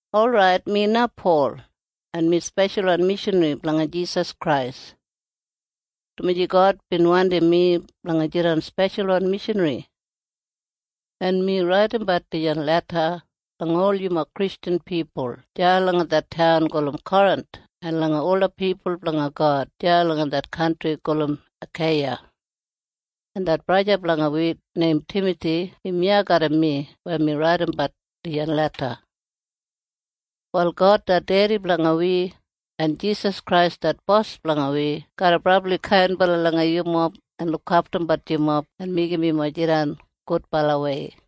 Orait, mi na Pol, en mi speshalwan mishanri blanga Jisas Krais, dumaji God bin wandim mi blanga jidan speshalwan mishanri. En mi raidimbat dijan leda langa ol yumob Kristjan pipul deya langa det taun gulum Korinth en langa ola pipul blanga God deya langa det kantri gulum Akeiya. En det braja blanga wi neim Timathi im iya garram mi weya mi raidimbat dijan leda. Wal God det dedi blanga wi en Jisas Krais det Bos blanga wi garra brabli kainbala langa yumob en lukaftumbat yumob en meigim yumob jidan gudbalawei.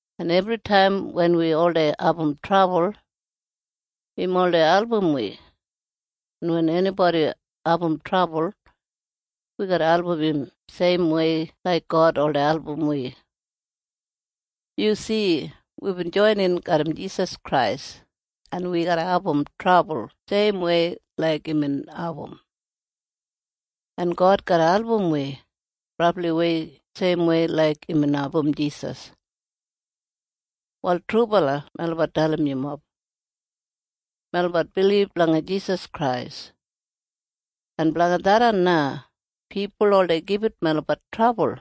En ebritaim wen wi oldei abum trabul, im oldei album wi. En wen enibodi abum trabul, wi garra album im seimwei laik God oldei album wi. Yu si? Wibin joinin garram Jisas Krais, en wi garra abum trabul seimwei laik imbin abum. En God garra album wi brabliwei seimwei laik imbin album Jisas. Wal trubala melabat dalim yumob. Melabat bilib langa Jisas Krais. En blanga tharran na pipul oldei gibit melabat trabul.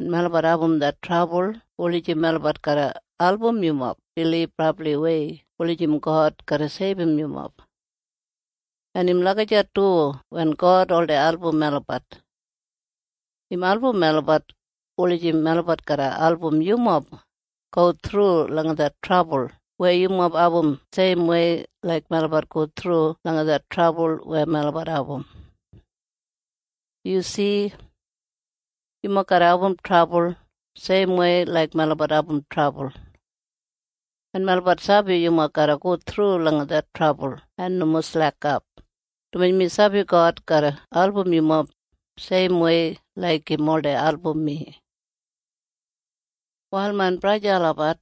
En melabat abum det trabul wulijim melabat garra album yumob bilib brabliwei wulijim God garra seibum yumob. En im lagijat du wen God oldei album melabat. Im album melabat wulijim melabat garra album yumob go thru langa det trabul weya yumob abum seimwei laik melabat go thru langa det trabul weya melabat abum. Yu si? Yumob garra abum trabul seimwei laik melabat abum trabul. En melabat sabi yumob garra go thru langa det trabul en nomo slekap, dumaji mi sabi God garra album yumob seimwei laik im oldei album mi. Wal main braja en sista olabat,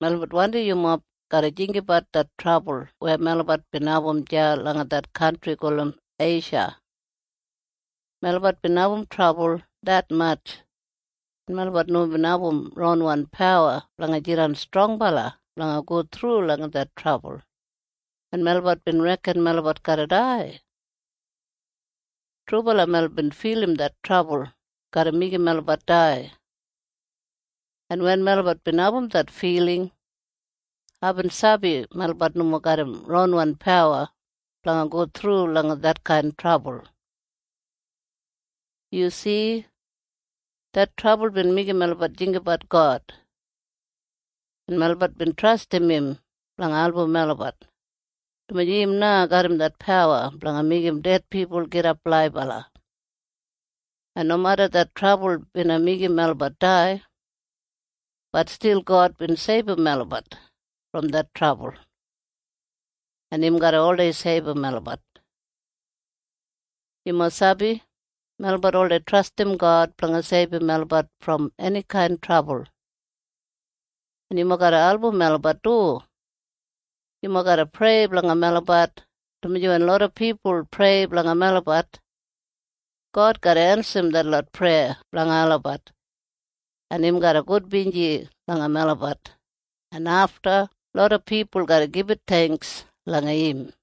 melabat wandim yumob garra jinggabat det trabul weya melabat bin abum deya langa det kantri gulum Eisha. Melabat bin abum trabul detmatj, en melabat nomo bin abum ronwan pawa blanga jidan strongbala blanga go thru langa det trabul, en melabat bin reken melabat garra dai. Trubala melabat bin filim det trabul garra meigim melabat dai. En wen melabat bin abum det filing, aibin sabi melabat nomo garram ronwan pawa blanga go thru langa detkain trabul. Yu si? Det trabul bin meigim melabat jinggabat God, en melabat bin trastim im blanga album melabat, dumaji im na garram det pawa blanga meigim ded pipul gidap laibala. En nomeda det trabul bina meigim melabat dai, bat stil God bin seibum melabat brom det trabul. En im garra oldei seibum melabat. Yumob sabi? Melabat oldei trastim God blanga seibum melabat brom enikain trabul. En yumob garra album melabat du. Yumob garra prei blanga melabat, dumaji wen loda pipul prei blanga melabat, God garra ensim detlot preya blanga olabat, en im garra gudbinji langa melabat, en afta loda pipul garra gibit theingks langa im.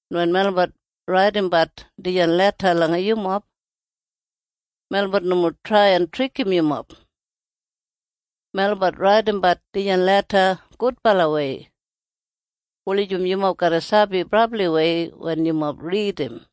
En wen melabat raidimbat dijan leda langa yumob, melabat nomo trai en trikim yumob. Melabat raidimbat dijan leda gudbalawei wulijim yumob garra sabi brabliwei wen yumob ridim.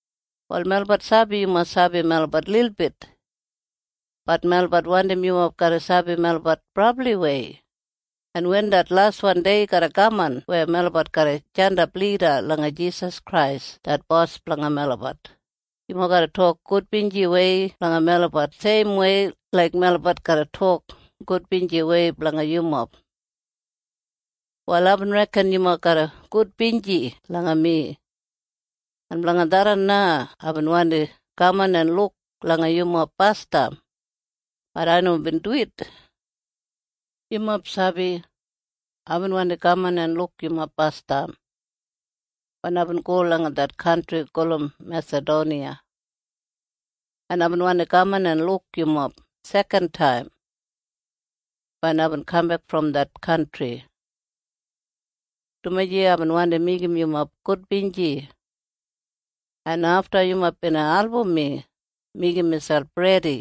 Wal melabat sabi yumob sabi melabat lilbit. Bat melabat wandim yumob garra sabi melabat brabliwei, en wen det laswan dei garra kaman weya melabat garra jandap lida langa Jisas Krais det Bos blanga melabat, yumob garra tok gudbinjiwei blanga melabat seimwei laik melabat garra tok gudbinjiwei blanga yumob. Wal aibin reken yumob garra gudbinji langa mi. En blanga tharran na aibin wandi kaman en luk langa yumob basdam. Bat ai nomo bin duwit. Yumob sabi? Aibin wandi kaman en luk yumob basdam wen aibin go langa det kantri gulum Mesadoniya, en aibin wandi kaman en luk yumob sekantaim wen aibin kambek brom det kantri, dumaji aibin wandi meigim yumob gudbinji, en afta yumob bina album mi meigim miselp redi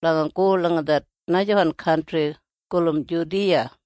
blanga go langa det najawan kantri gulum Judiya.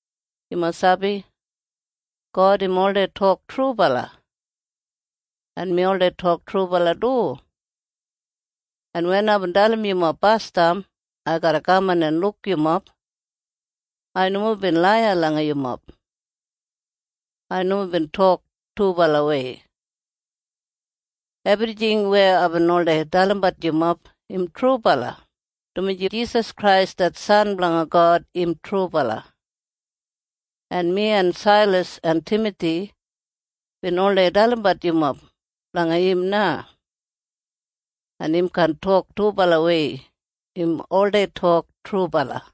Yumob sabi? God im oldei tok trubala, en mi oldei tok trubala du. En wen aibin dalim yumob basdam ai garra kaman en luk yumob, ai nomo bin laiya langa yumob. Ai nomo bin tok dubalawei. Ebrijing weya aibin oldei dalimbat yumob im trubala, dumaji Jisas Krais det San blanga God im trubala. En mi en Sailas en Timathi bin oldei dalimbat yumob blanga im na. En im kaan tok dubalawei. Im oldei tok trubala.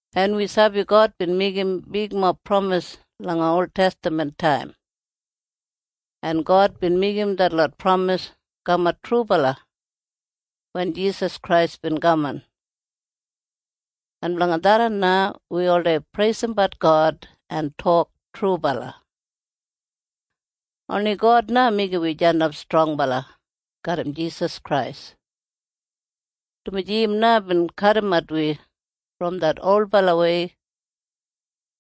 En wi sabi God bin meigim bigmob pramis langa oltestaman taim. En God bin meigim detlot pramis kamat trubala wen Jisas Krais bin kaman. En blanga tharran na wi oldei preisimbat God en tok, “Trubala.” Oni God na meigim wi jandap strongbala garram Jisas Krais, dumaji im na bin kadimat wi brom det olbalawei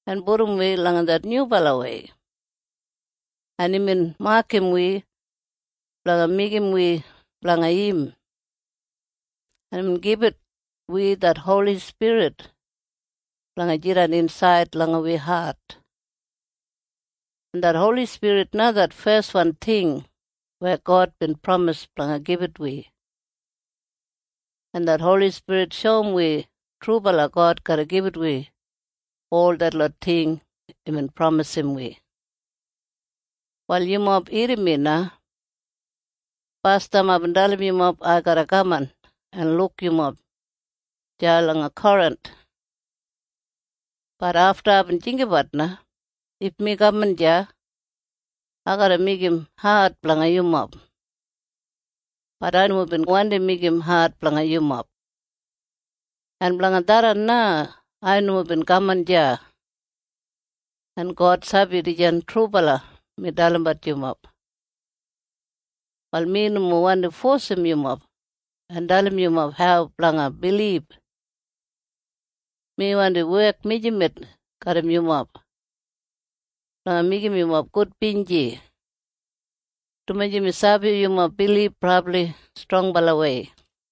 en pudum wi langa det nyubalawei, en imbin makam wi blanga meigim wi blanga im, en imbin gibit wi det Holi Spirit blanga jidan insaid langa wi hat, en det Holi Spirit na det feswan ting weya God bin pramis blanga gibit wi, en det Holi Spirit shoum wi trubala God garra gibit wi ol detlot ting weya imbin pramisim wi. Wal yumob irrim mi na. Basdam aibin dalim yumob ai garra kaman en luk yumob deya langa Korinth. Bat afta aibin jinggabat na. If mi kaman deya, ai garra meigim ad blanga yumob. Bat ai nomo bin wandi meigim ad blanga yumob. En blanga tharran na ai nomo bin kaman deya. En God sabi dijan trubala mi dalimbat yumob. Wal mi nomo wandi fosim yumob en dalim yumob hau blanga bilib. Mi wandi wek mijamet garram yumob blanga meigim yumob gudbinji, dumaji mi sabi yumob bilib brabli strongbalawei.